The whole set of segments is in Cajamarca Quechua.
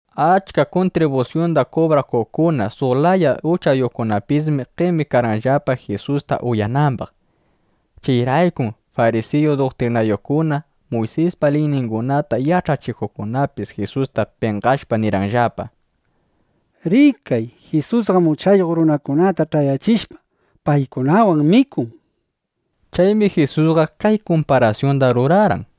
Achka kuntribusyunda kubrakuqkuna, suq laya uchayuqkunapismi qemikarqanllapa, Jisusta uyanambaq. Chayraykum farisiyu duktrinayuqkuna, Muysispa liyningunata yach'achikuqkunapis Jisusta penqashpa nirqanllapa: —Rikay, Jisusqam uchayuq runakunata ch'ayachishpa, paykunawan mikun, nishpa. Chaymi Jisusqa kay kumparasyunda rurarqan: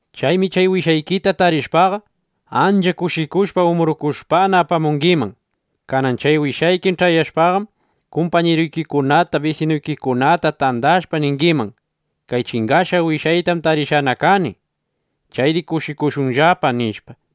Chaymi chay wishaykita tarishpaqa, ancha kushikushpa umbrukushpana apamungiman. Kanan wasikiman ch'ayashpaqam, kumpañiruykikunata, bisinuykikunata tandashpa, ningiman: “¡Kay chingashqa wishaytam tarishqana kani! ¡Chayri kushikushunllapa!” nishpa.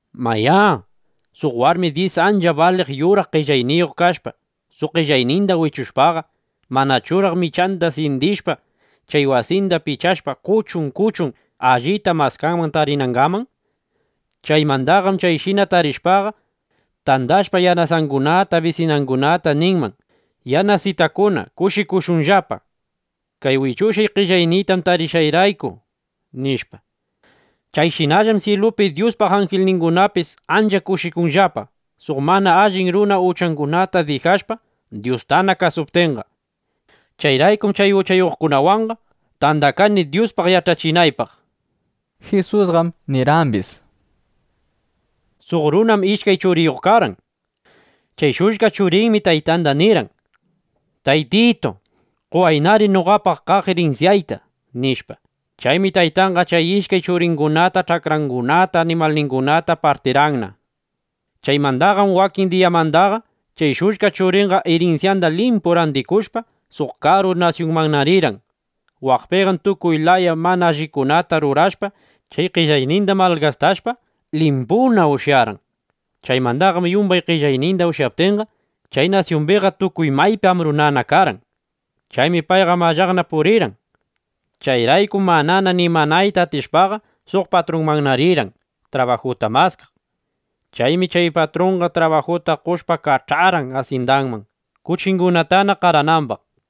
’Mayá, suq warmi dyis ancha baliq yuraq qellayniyuq kashpa, suq qellayninda wichushpaqa, ¿manachuraq michanda syindishpa, chay wasinda pichashpa, kuchun kuchun allita maskanman tarinangaman? Chaymandaqam chayshina tarishpaqa, tandashpa yanasangunata, bisinangunata ninman: “Yanasitakuna, kushikushunllapa, kay wichushqay qellayniyta tarishqayrayku”, nishpa. Chayshinallam syilupi Dyuspa anjilningunapis ancha kushikunllapa suq mana allin runa uchangunata dijashpa, Dyustana kasuptinqa. (Chayraykum chay uchayuqkunawanqa tandakani, Dyuspaq yach'achinaypaq), nishpa. Jisusqam nirqambis: —Suq runam ishkay churiyuq karqan. Chay shullka churinmi taytanda nirqan: “Taytitu, qowaynari noqapaq kaq irinsyayta”, nishpa. Chaymi taytanqa chay ishkay churingunata ch'akrangunata animalningunata partirqanna. Chaymandaqam wakin diyamandaqa, chay shullka churinqa irinsyanda limpu randikushpa, suq karu nasyunmanna rirqan. Waqpiqam tukuy laya mana allikunata rurashpa, chay qellayninda malgastashpa, limpuna ushyarqan. Chaymandaqam yumbay qellayninda ushyaptinqa, chay nasyumbiqa tukuy maypi ambrunana karqan. Chaymi payqa mallaqna purirqan. Chayraykum manana nimanayta atishpaqa, suq patrunmanna rirqan, trabajuta maskaq. Chaymi chay patrunqa trabajuta qoshpa, kach'arqan asyindanman, kuchingunata qaranambaq.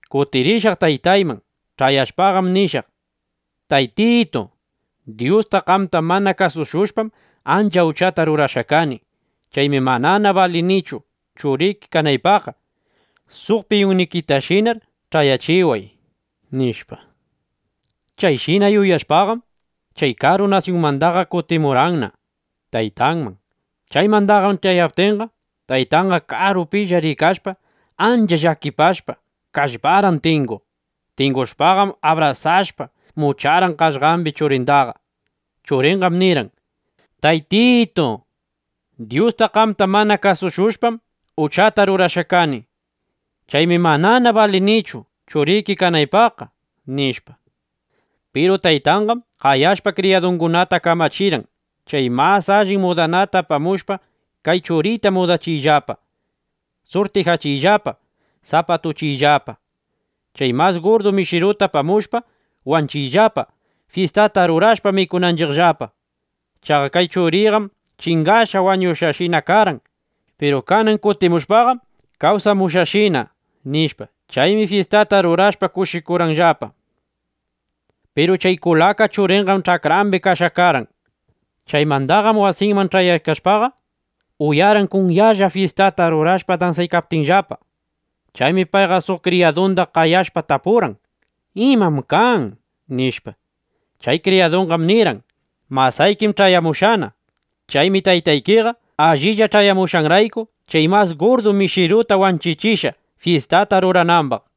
Kutirishaq taytayman. Ch'ayashpaqam nishaq: Taytitu, Dyusta, qamta mana kasushushpam, ancha uchata rurashqa kani. Chaymi manana balinichu, churiki kanaypaqqa. Suq piyunnikitashinar ch'ayachiway”, nishpa. Chayshina yuyashpaqam, chay karu nasyunmandaqa kutimurqanna taytanman. ’Chaymandaqam ch'ayaykaptinqa, taytanqa karupilla rikashpa, ancha llakipashpa, kallparqan tinguq. Tingushpaqam abrasashpa, mucharqan qaqllambi churindaqa. Churinqam nirqan: “Taytitu, Dyusta, qamta mana kasushushpam, uchata rurashqa kani. Chaymi manana balinichu, churiki kanaypaqqa”, nishpa. Piru taytanqam qayashpa kriyadungunata kamachirqan: “Chay mas allin mudanata apamushpa, kay churiyta mudachiyllapa, surtijachiyllapa, sapatuchiyllapa. Chay mas gurdu mishiruta apamushpa, wanchiyllapa, fyistata rurashpa mikunanchiqllapa. Chaqa kay churiyqam chingashpa, wañushqashina karqan. Piru kanan kutimushpaqam, kawsamushqashina”, nishpa. Chaymi fyistata rurashpa kushikurqanllapa. ’Piru chay kulaka churinqam ch'akrambi kashqa karqan. Chaymandaqam wasinman ch'ayaykashpaqa, uyarqan kunyalla fyistata rurashpa dansaykaptinllapa. Chaymi payqa suq kriyadunda qayashpa tapurqan: “¿Imam kan?” nishpa. Chay kriyadunqam nirqan: “Masaykim ch'ayamushqana. Chaymi taytaykiqa allilla ch'ayamushqanrayku, chay mas gurdu mishiruta wanchichishqa, fyistata ruranambaq”, nishpa.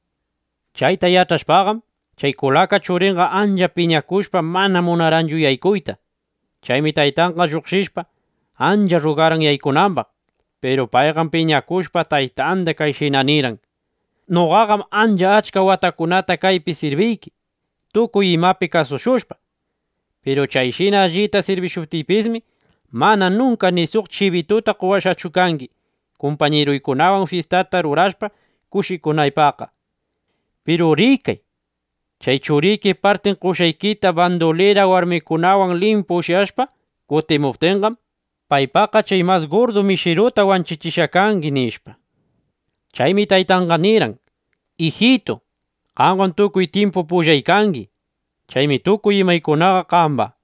Chayta yach'ashpaqam, chay kulaka churinqa ancha piñakushpa, manana munarqanchu yaykuyta. Chaymi taytanqa lluqshishpa, ancha rrugarqan yaykunambaq. Piru payqam piñakushpa, taytanda kayshina nirqan: “Noqaqam ancha achka watakunata kaypi sirbiyki, tukuy imapi kasushushpa. Piru chayshina allita sirbishuptiypismi, mana nunka ni suq chibituta qowashqachu kangi, kumpañiruykunawan fyistata rurashpa kushikunaypaqqa. Piru rikay, chay churiki partin qoshqaykita bandulira warmikunawan limpu ushyashpa kutimuptinqam, paypaqqa chay mas gurdu mishiruta wanchichishqa kangi”, nishpa. Chaymi taytanqa nirqan: “Ijitu, qamqam tukuy tyimpu pullay kangi. Chaymi tukuy imaykunaqa qamba.